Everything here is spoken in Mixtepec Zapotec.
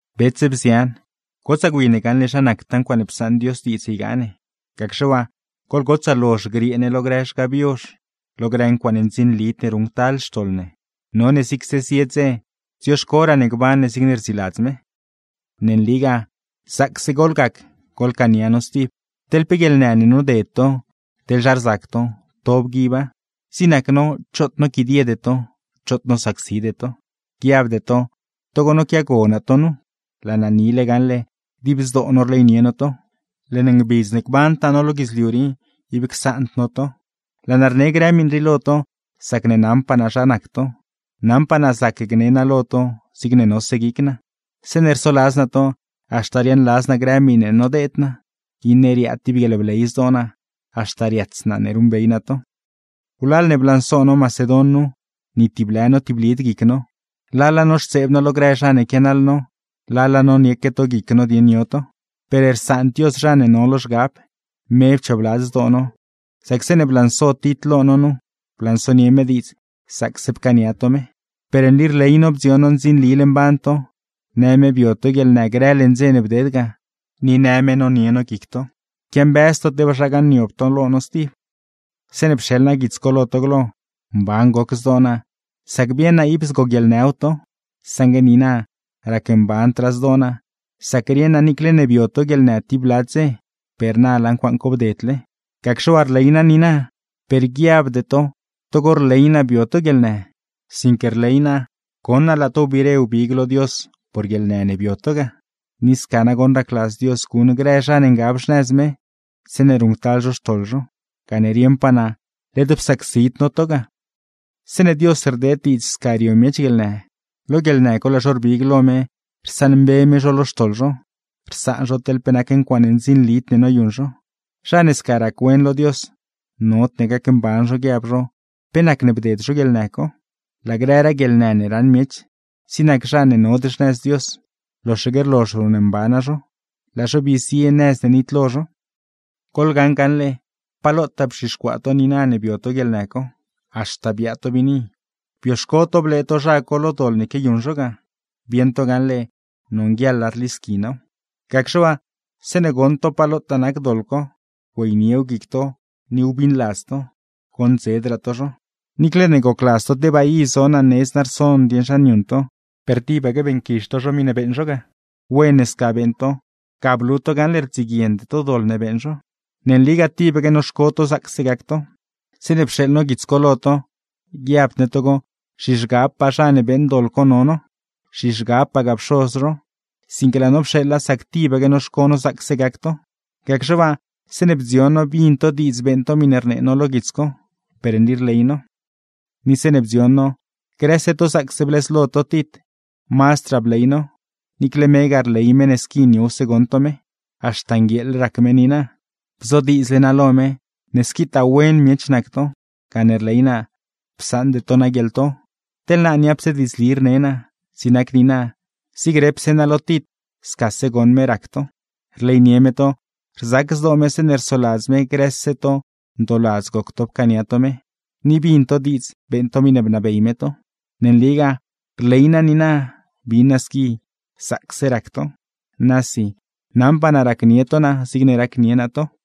Bets, bzian, gotsaa gwi ne gaṉle zha nactaa ncuaaṉe psaṉ Dios diidz ygaa ne. Gacxe waa, goḻgotsaa lozh griee ne lo grë zhgab yozh, lo grë ncuaaṉe ndzinlid ne ruṉctal xtoḻ ne. None zigse zie dze dzioxcoraa ne gban ne zigne rdziladz me. Ne nligaa, zaacse goḻgac goḻcaania no stib. Teḻ pe guieḻnë ne noded to, teḻ zha rzac to, to bguiba; zig nac no, choot noquidiede to, choot nosacside to. Guiabde to togo noquiago naa to nu, laa naa nile gaṉle dib zdoo no rleynie no to. Leṉ ngbidz ne gbantaa no lo guidzliu rii, ib csaand no to. Laa naa rne grë miṉ rii lo to, sacne naṉpaa naa zha nac to, naṉpaa naa zac gne naa lo to zigne nose guic naa. Zeeṉe rsoladz naa to, haxta riaaṉladz naa grë miṉe nodeed naa, iṉe riaad tib guieḻbley zdoo naa; haxta riats naa ne ruṉbey naa to. Wlal ne blanso no Macedon nu, ni tib lë notiblid guic no; lala noxtseeb no lo grë zha ne quianaḻ no, lala nonieque to guic no dieṉ yo to. Per rsaand Dios zha ne no lo zhgab, me pchoobladz zdoo no; sac zeeṉe blanso Tit lo no nu, blansonie me diidz zaacse pcaania to me. Per nli rley no bdzion ndzinlile mban to, në me bio to guieḻnë grë leṉ dze ne bded ga, ni në me nonie no guic to, quiambëz to tebaa zha gaṉniob to lo no stib. Zeeṉe pxeḻ naa guits co lo to glo, mban goc zdoo naa sac bieṉ naa ib zgoguieḻnëw to, saṉgue niina racmbandraa zdoo naa; sac rieṉ naa niicle ne bio to guieḻnë tib bla dze, per na laa ncuaaṉ co bdedle. Gacxe waa rley naa niina, per guiabde to togo rley naa bio to guieḻnë, sinque rley naa goṉ naa laa to wbiire wbig lo Dios por guieḻnë ne bio to ga. Ni sca nagoṉ racladz Dios guṉ grë zha ne ngab xnëz me zeeṉe ruṉctal zho xtoḻ zho, gane rieṉpaa naa led psacsid no to ga. Zeeṉe Dios rdeed diidz sca rio miech guieḻnë, lo guieḻnë co laa zho rbig lo me rsaṉmbe me zho lo xtoḻ zho; rsaan zho teḻ pe nac ncuaaṉe ndzinlid ne noyuṉ zho. Zha ne sca rac-wen lo Dios, nodne gacmban zho guiab zho pe nacne bded zho guieḻnë co. Laa grëraa guieḻnë ne raṉ miech, zig nac zha ne nod xnëz Dios, loxaque rlozh ruṉmbana zho, laa zho bii zie nëz ne nitlo zho. Goḻgaṉ gaṉle, pa lotaa bzhixcuaa to niina ne bio to guieḻnë co. Haxta biaa to biini, bioxco to blee to zha co lo doḻ ne quiayuṉ zho ga; bieṉ to gaṉle nonguieḻa rlisqui naaw. Gacxe waa, zeeṉe goṉ to pa lotaa nac doḻ co, güeyniew guic to ni wbiṉladz to; goṉdzedraa to zho. Niicle ne gocladz to tebaa i zo naa nedz naa rson dieṉ zha niuṉ to; per tibaque beeṉquizh to zho miṉe beeṉ zho ga. Wen ne sca beeṉ to, ga blu to gaṉle rdziguiende to doḻ ne beeṉ zho. Ne nligaa tibaque noxco no zaacse gac to. Zeeṉe pxeeḻ no guits co lo to, guiabd ne togo zhizhgabpaa zha ne beeṉ doḻ co no no, zhizhgabpagaa pxoz zho; sinque laa no pxeeḻa sac tibaque noxco no zaacse gac to. Gacxe waa, zeeṉe bdzion no bin to diidz beeṉ to miṉe rnee no lo guits co, per nli rley no. Ni zeeṉe bdzion no grëse to zaacse blëzlo to Tit, mazdraa bley no; niicle megaa rley me ne squi niowse goṉ to me; haxta nguieeḻ rac me niina. Bzodiidzle naa lo me, ne squitaa wen miech nac to, gane rley naa psaṉde to naa guieḻto. Teḻ naa niapse diidzli rne naa, zig nac niina, zig repse naa lo Tit scase goṉ me rac to. Rleynie me to, rzac zdoo me zeeṉe rsoladz me grëse to ndooladz goc to pcaania to me, ni bin to diidz beeṉ to miṉe bnabey me to. ¡Ne nligaa, rley naa niina bin naa squi zaacse rac to! ¡Nasi, naṉpaa naa racnie to naa zigne racnie naa to!